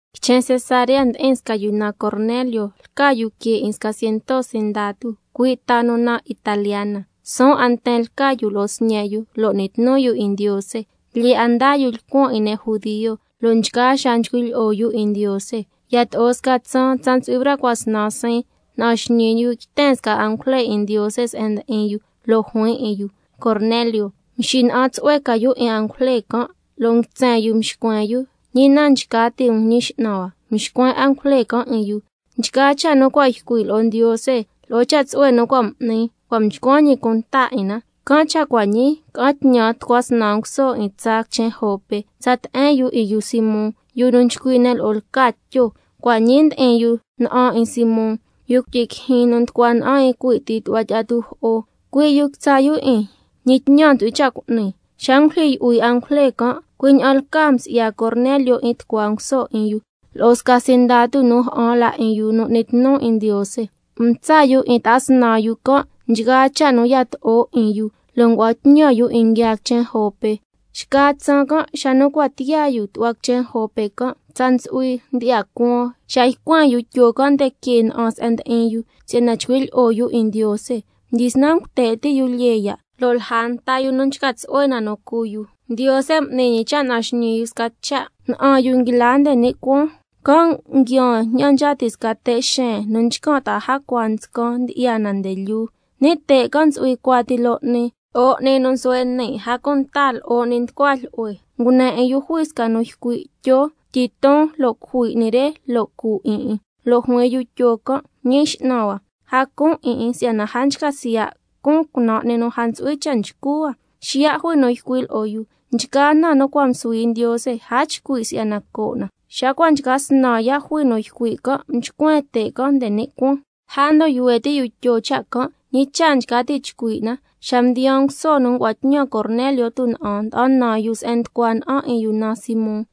Quichen Cesarea ndi'in sca yu naan Cornelio, lca yu que 'in sca ciento sindatu, cui' ta nu naan Italiana. Suun 'a nten lca yu lo'o sñe' yu, n'ni tnu yu 'in Ndiose. Lyee 'a ndaa yu lcuan 'in ne' judio, lo' nchgaa xaa nchcui' lyi'o yu 'in Ndiose. Yato'o sca tsaan, tsa ntsu'hui braa cua' snan siin, na'an xñii yu yten sca angujle 'in Ndiose se'en ndi'in yu, lo' juin 'in yu: Cornelio. Xacan' mxina'an tsu'hue ca yu 'in angujle can', lo' nguitsen yu mxcuen yu: ¿Ñi na nchca ti' um cu'nin, Ñi X'nan hua? Mxcuen angujle can' 'in yu: Nchgaa cha' nu cua' ycui' lo'o Ndiose lo'o cha' tsu'hue nu cua' m'ni, cua' mchcuan ñi cunta 'in na. Can' cha' cua' ñii, ca'an tñan tucua snan nguso 'in tsaa quichen Jope, tsa te'en yu 'in yu Simón, yu nu nchcui' ne' lo'o lca Tyo. Cua' ñii ndi'in yu na'an 'in Simón, yu cuityi quijyin nu nducua na'an 'in cui' ti tu'hua tyi'a tujo'o. Cui' yu quitsa' yu 'in, ñi tñan ntsu'hui cha' cu'ni. Xa ngulyijyi yu'hui angujle can', cui' ña'an lcaa msi'ya Cornelio 'in tucua nguso 'in yu, lo'o sca sindatu nu ja'an la 'in yu nu n'ni tnu 'in Ndiose, mtsa' yu 'in ta'a snan yu can' nchgaa cha' nu yato'o 'in yu, lo' ngua'an tñan yu 'in nguiaa quichen Jope. Xca tsaan can', xa nu cua' tiyaa ti yu tu'hua quichen Jope can', tsa ntsu'hui ndyi'ya cuan xa ycuen yu Tyo can' nde que na'an se'en ndi'in yu, si'yana chcui' lyi'o yu 'in Ndiose. Mdyisnan nguite' ti' yu lyee ya', lo' lja nta yu nu nchca tsu'hue na nu cu yu, Ndiose m'ni ñi cha' na'an xñii yu sca cha'. Na'an yu nguila nde ni' cuaan, can' nguiaan ña'an nchca ti' sca te' xeen nu nchcan' ta'a jacua nscan, ndyi'ya na nde lyuu. Ni' te' can' ntsu'hui cuati loo 'ni, lo'o 'ni nu nsuhue' ni', a cunta lo'o 'ni nducua jlyu'hue. Ngune 'in yu jui sca nu ycui': Tyo, tyiton lo' cujui 'ni re, lo' cu 'in 'in. Lo' juin yu Tyo can': Ñi X'nan hua, a cun 'in 'in si'yana a nchca siya' cun cunan' 'ni nu a ntsu'hui cha' nchcu hua. Xiya' jui nu ycui' lo'o yu: Nchgaa na nu cua' msuhui Ndiose, a chcui' si'yana coo' na. Xa cua' nchca snan ya' jui nu ycui' can', xacan' mchcuen te' can' nde ni' cuaan. Lja ndon yuhue ti' yu Tyo cha' can', ñi cha' nchca ti' na chcui' na, xa mdiyaa nguso nu ngua'an tñan Cornelio tuna'an, ñicha' yu la ca nducua na'an 'in yu naan Simón.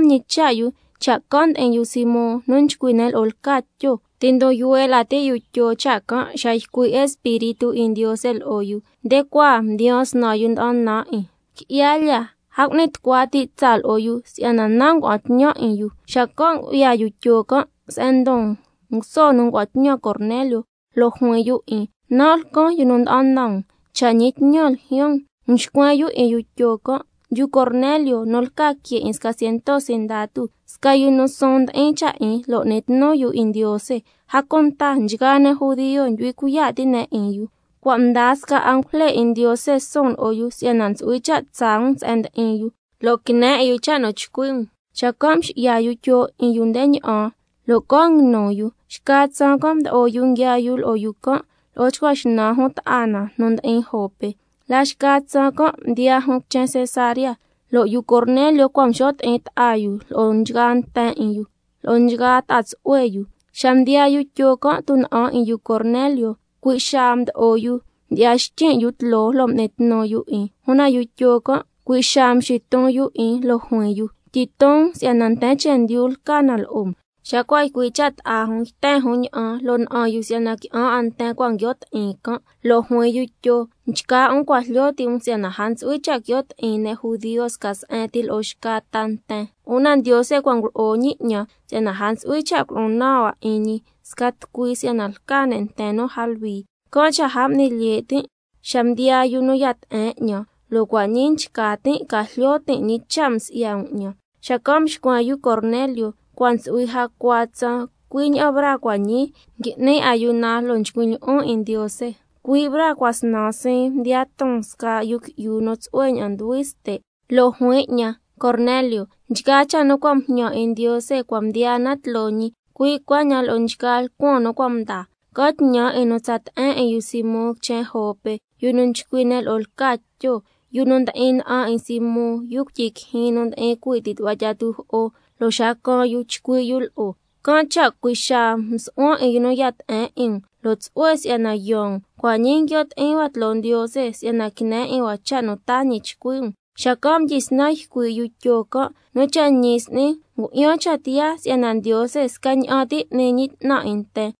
Mñicha' yu cha' can' ndi'in yu Simón, nu nchcui' ne' lo'o lca Tyo. Ti' ndon yuhue la ti' yu Tyo cha' can' xa ycui' Espíritu 'in Ndiose lo'o yu: Nde cua' mdiyaan snan yu nda'an nan 'in. Qui'ya lya, a cu'ni tucua ti' tsaa lo'o yu, si'yana nan' ngua'an tñan 'in yu. Xacan' ngu'ya yu Tyo can' se'en ndon nguso nu ngua'an tñan Cornelio, lo' juin yu 'in: Nan' lcan yu nu nda'an nan um, cha' ñi tñan ljyaan um? Mxcuen yu 'in yu Tyo can': Yu Cornelio, nu lca que 'in sca ciento sindatu, sca yu nu suun ndi'in cha' 'in, lo' n'ni tnu yu 'in Ndiose, a cunta nchgaa ne' judio ndyu'hui cuiya' ti' ne' 'in yu, lo' sca angujle 'in Ndiose cua' mdaa suun lo'o yu si'yana ntsu'hui cha' tsaa um se'en ndi'in yu, lo' quine 'in yu cha' nu chcui' um. Xacan' mxi'ya yu Tyo 'in yu nde ña'an lo' can' nguinu yu. Xca tsaan can' mdo'o yu nguiaa yu lo'o yu can', lo'o chcua xnan jun ta'a na nu ndi'in Jope. La xca tsaan can' mdiyaa jun quichen Cesarea, lo' yu Cornelio cua' mxo' ti'in ta'a yu lo'o nchgaa nten 'in yu, lo'o nchgaa ta'a tsu'hue yu. Xa mdiyaa yu Tyo can' tuna'an 'in yu Cornelio, cui' xaa mdo'o yu, mdon xtyin' yu tloo, lo' m'ni tnu yu 'in. Una yu Tyo can' cui' xaa mxiton yu 'in, lo' juin yu: Tyiton um si'yana nten chendyu lcan na lo'o um. Xa cua' ycui' cha' ta'a jun, xacan' yten jun ña'an, lo' na'an yu si'yana qui'an 'a nten cua' nguio' ti'in can'. Lo' juin yu Tyo: Nchgaa um cua' jlyo ti' um si'yana a ntsu'hui cha' quio' ti'in ne' judio sca se'en ti lo'o xca ta nten. Una Ndiose cua' ngulo'o ñi 'ñan si'yana a ntsu'hui cha' culo'o naan hua 'in ñi sca tucui si'yana lca ne' nten nu a luhui. Can' cha' a m'ni lye' tin' xa mdiyaa yu nu ya te'en 'ñan, lo' cua' ñii nchca tin' ca jlyo tin' ñi cha' msi'ya um 'ñan. Xacan' mxcuen yu Cornelio: Cua' ntsu'hui jacua tsaan, cui' ña'an braa cua' ñii, ngui'nin ayuna lo' nchcuin' lyi'on 'in Ndiose, cui' braa cua' snan siin mdiya ton sca yu qui'yu nu tsu'hue ña'an nduhui ste', lo' juin 'ñan: Cornelio, nchgaa cha' nu cua' mjñan 'in Ndiose cua' mdiyaa na tloo ñi, cui' cuaña'an lo'o nchgaa lcuan nu cua' mdaa. Ca'an tñan 'in nu tsa te'en 'in yu Simón quichen Jope, yu nu nchcui' ne' lo'o lca Tyo, yu nu ndi'in na'an 'in Simón, yu cuityi quijyin nu ndi'in cui' ti tu'hua tyi'a tujo'o, lo' xa caan yu chcui' yu lo'o. Can' cha' cui' xaa msu'huan 'in yu nu ya te'en 'in um, lo' tsu'hue si'yana yaan um. Cua' ñii nguio' ti'in hua tloo Ndiose, si'yana quine 'in hua cha' nu taa ñi chcui' um. Xacan' mdyisnan ycui' yu Tyo can': Nu cha' ñi s'ni ngu'yan cha' tiyaa si'yana Ndiose scaña'an ti n'ni ñi 'tnan 'in nten,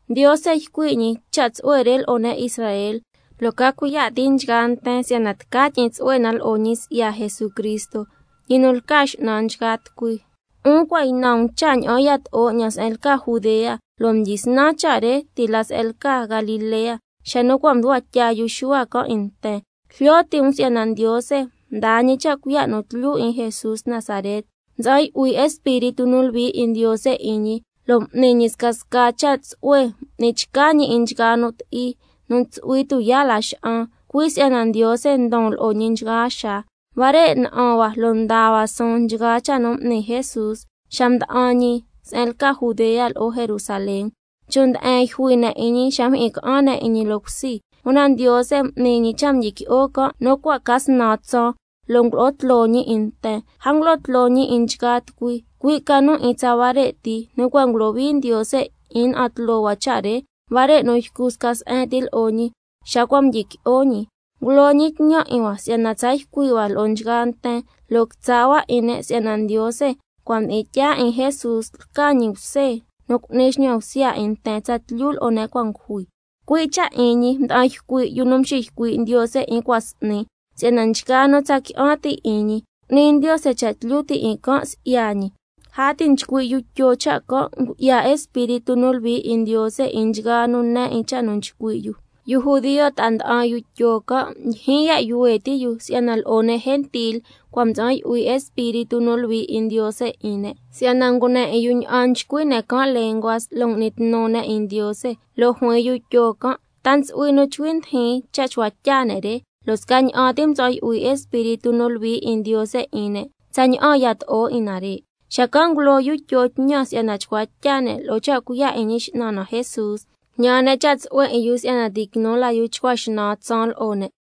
Ndiose ycui' ñi cha' tsu'hue 'in ñi lo'o huare' ne' Israel, se'en nu tyi'in tsu'hue na lo'o ñi si'ya Jesucristo, ñi nu lca X'nan nchgaa tucui. 'Un cua' ynan um cha' ña'an yato'o ña'aan se'en lca Judea, lo' mdyisnan cha' re ti' la se'en lca Galilea, xa nu cua' mducua tya yu Xuhua can' 'in nten, lo' jlyo ti' um si'yana Ndiose mdaa ñi cha' cuiya' nu tlyu 'in Jesús Nazaret, lo' mtsa'an yu'hui Espíritu nu Luhui 'in Ndiose 'in ñi, lo' m'ni ñi scasca cha' tsu'hue, m'ni chca ñi 'in nchgaa nu ti'i nu ntsu'hui tuyaa' laxa'an, cui' si'yana Ndiose ndon lo'o ñi nchgaa xaa. Huare' na'an hua lo' ndaa hua suun nchgaa cha' nu m'ni Jesús xa mda'an ñi se'en lca Judea lo'o Jerusalén, chon' nde'en yjui ne' 'in ñi xa mjyi'in ca'an ne' 'in ñi loo cusi. Una Ndiose m'ni ñi cha' mdyiqui'o can' nu cua' ca snan tsaan, lo' ngulo'o tloo ñi 'in nten. A ngulo'o tloo ñi 'in nchgaa tucui, cui' ca nu 'in tsa huare' ti nu cua' ngulohui Ndiose 'in na'an tloo hua cha' re, huare' nu ycu sca se'en ti lo'o ñi xa cua' mdyiqui'o ñi. Ngulo ñi tñan 'in hua si'yana tsa ycui' hua lo'o nchgaa nten, lo' quitsa' hua 'in ne' si'yana Ndiose cua' mdi'in tyaa 'in Jesús lca ñi Bse nu cu'ni xñan bsya 'in nten tsatlyu lo'o ne' cua' ngujui. Cui' cha' 'in ñi mda'an ycui' yu nu mxiycui' Ndiose 'in cua' s'ni, si'yana nchgaa nu tsa qui'an ti' 'in ñi, cu'ni Ndiose cha' tlyu ti' 'in can' si'ya ñi. Lja ti' nchcui' yu Tyo cha' can', ngu'ya Espíritu nu Luhui 'in Ndiose 'in nchgaa nu ne 'in cha' nu nchcui' yu. Yu judio ta'a nda'an yu Tyo can', ndyijyin ya' yuhue ti' yu si'yana lo'o ne' gentil cua' mtsa'an yu'hui Espíritu nu Luhui 'in Ndiose 'in ne', si'yana ngune 'in yu ña'an nchcui' ne' can' lenguas, lo' ngui'ni tnu ne' 'in Ndiose. Lo' juin yu Tyo can': ¿Ta ntsu'hui nu nchcui ndijin cha' chcua tya ne' re, lo' scaña'an ti mtsa'an yu'hui Espíritu nu Luhui 'in Ndiose 'in ne', tsaña'an yato'o 'in nare'? Xacan' ngulo yu Tyo tñan si'yana chcua tya ne' lo'o cha' cuiya' 'in Ñi X'nan na Jesús. Mjñan ne' cha' tsu'hue 'in yu si'yana ti' quinu la yu chcua xnan tsaan lo'o ne'.